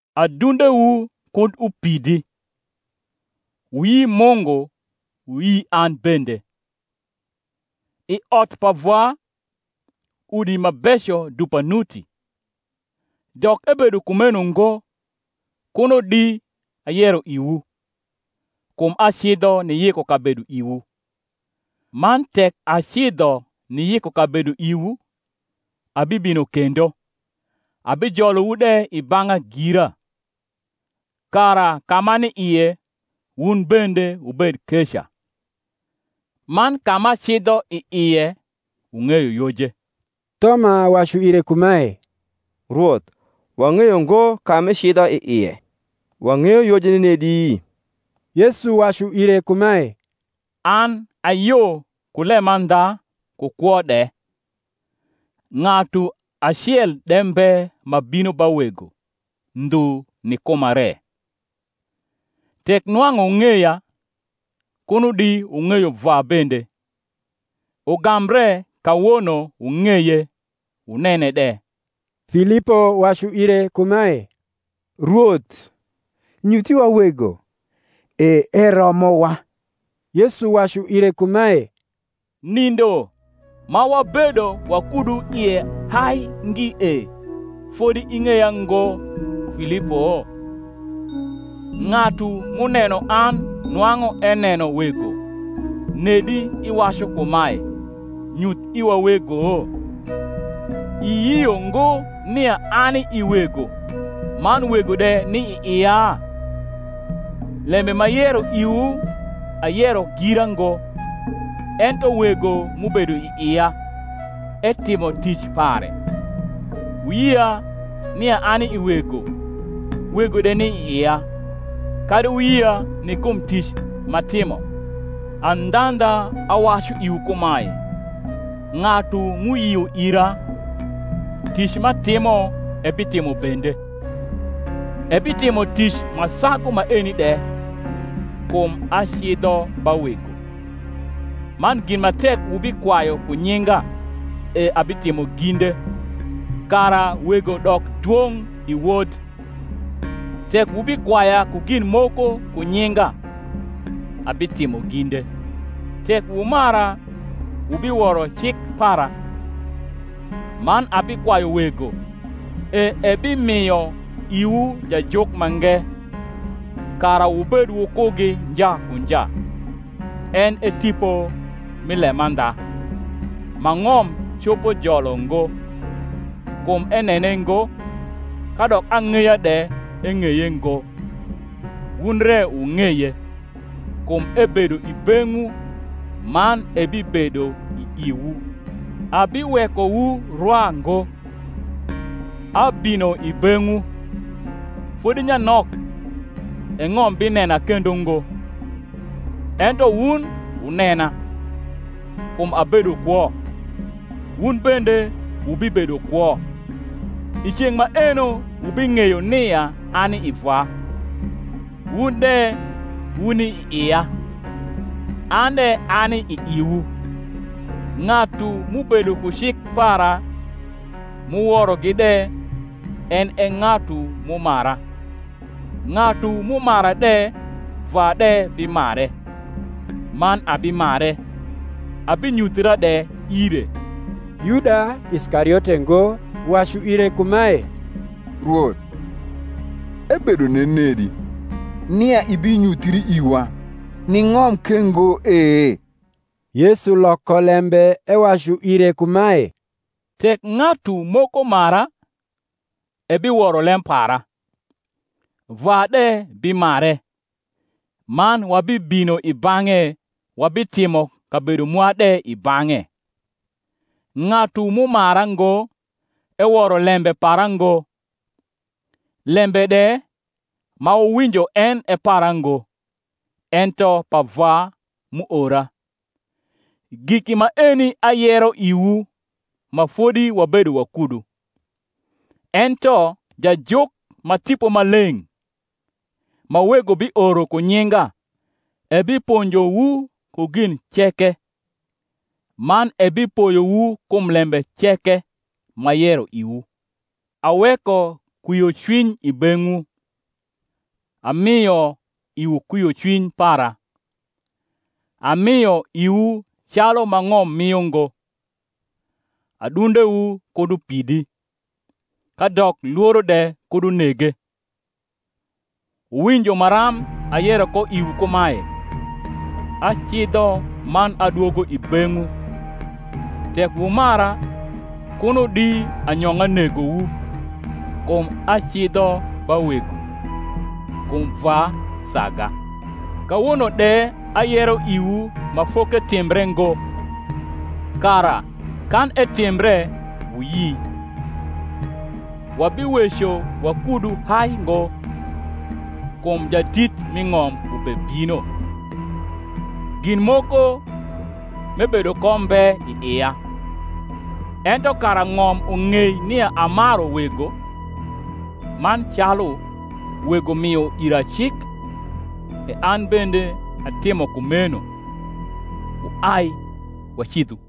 Adnndewu knd upidi: wuyi Mungu, wuyi an bende. I ot pa Vwa udi ma beco dupa nuti; dok ebedo kumeno ngo, kuno di ayero iwu; kum acidho niyiko kabedo iwu. Man tek acidho niyiko kabedo iwu, abibino kendo, abijolowu de i bang’a gira; kara ka m’ani ie, wun bende wubed keca. Man ka m’acidho i ie, wung’eyo yoje. Thoma wacu ire kumae, Rwoth, wang’eyo ngo ka m’icidho i ie; wang’eyo yoje nenedi? Yesu wacu ire kumae, An a yo ku lemandha, ku kwo de: Ng’atu acel de mbe ma bino ba Wego, ndhu ni kuma re. Tek nwang’u wung’eya, kuno di wung’eyo Vwa bende: ugambre kawono wung’eye, wunene de. Filipo wacu ire kumae, Rwoth, nyuth iwa Wego, e eromowa. Yesu wacu ire kumae, Nindo ma wabedo wakudu ie hai ngi e, fodi ing’eya ngo, Filipo? ng’atu m’uneno an nwang’u eneno Wego; nedi iwacu kumae, Nyuth iwa Wego? Iyio ngo nia ani i Wego, man Wego de ni i ia? lembe m’ayero iwu ayero gira ngo: ento Wego m’ubedo i ia etimo tic pare. Wuyia nia ani i Wego, Wego de ni i ia: kadi wuyia ni kum tic m’atimo. Andhandha, awacu iwu kumae, Ng’atu m’uyio ira, tic m’atimo ebitimo bende; ebitimo tic ma sagu maeni de; kum acidho ba Wego. Man gin ma tek wubikwayu ku nyinga e abitimo ginde, kara Wego dok dwong’ i Wod; Tek wubikwaya ku gin moko ku nyinga, abitimo ginde. Tek wumara wubiworo cik para. Man abikwayu Wego, e ebimio iwu Jajuk mange, kara wubed wukugi nja ku nja, en e Tipo mi lemandha: ma ng’om copo jolo ngo; kum enene ngo, kadok ang’eya de eng’eye ngo; wun re wung’eye; kum ebedo i beng’wu, man ebibedo i iwu. Abiwekowu rwa ngo: abino i beng’wu. Fodi nyanok, e ng’om binena kendo ngo; ento wun wunena: kum abedo kwo, wun bende wubibedo kwo. I ceng’ maeno wubing’eyo nia ani i Vwa, wun de wuni i ia, an de ani i iwu. Ng’atu m’ubedo ku cik para, m’uworogi de, en e ng’atu m’umara: ng’atu m’umara de Vwa de bimare, man abimare, abinyuthra de ire. Yuda (Iskariote ngo) uwacu ire kumae, Rwoth, ebedo nenedi nia ibinyuthii iwa, ni ng’om ke ngo e? Yesu loko lembe ewacu ire kumae, Tek ng’atu moko mara, ebiworo lem para: Vwa de bimare, man wabibino i bang’e wabitimo kabedo mwa de i bang’e. Ng’atu m’umara ngo eworo lembe para ngo: lembe de ma wuwinjo en e para ngo, ento pa Vwa m’uora. Giki maeni ayero iwu, ma fodi wabedo wakudu. Ento Jajuk, ma Tipo Maleng’, ma Wego bioro ku nyinga, ebiponjowu ku gin ceke, man ebipoyowu kum lembe ceke m’ayero iwu. Aweko kwiocwiny i beng’wu; amio iwu kwiocwiny para: amio iwu calu ma ng’om mio ngo. Adundewu kud upidi, kadok lworo de kud unege. Wuwinjo maram ayero ko iwu kumae, Acidho, man adwogo i beng’wu. Tek wumara, kuno di anyong’a negowu, kum acidho ba Wego: kum Vwa saga. Kawono de ayero iwu ma foketimbre ngo, kara, kan etimbre, wuyi. Wabiweco wakudu hai ngo, kum jadit mi ng’om ubebino: gin moko m’ebedo ko mbe i ia; ento kara ng’om ung’ei nia amaru Wego, man calu Wego mio ira cik, e an bende atimo kumeno. Wuai, wacidhu.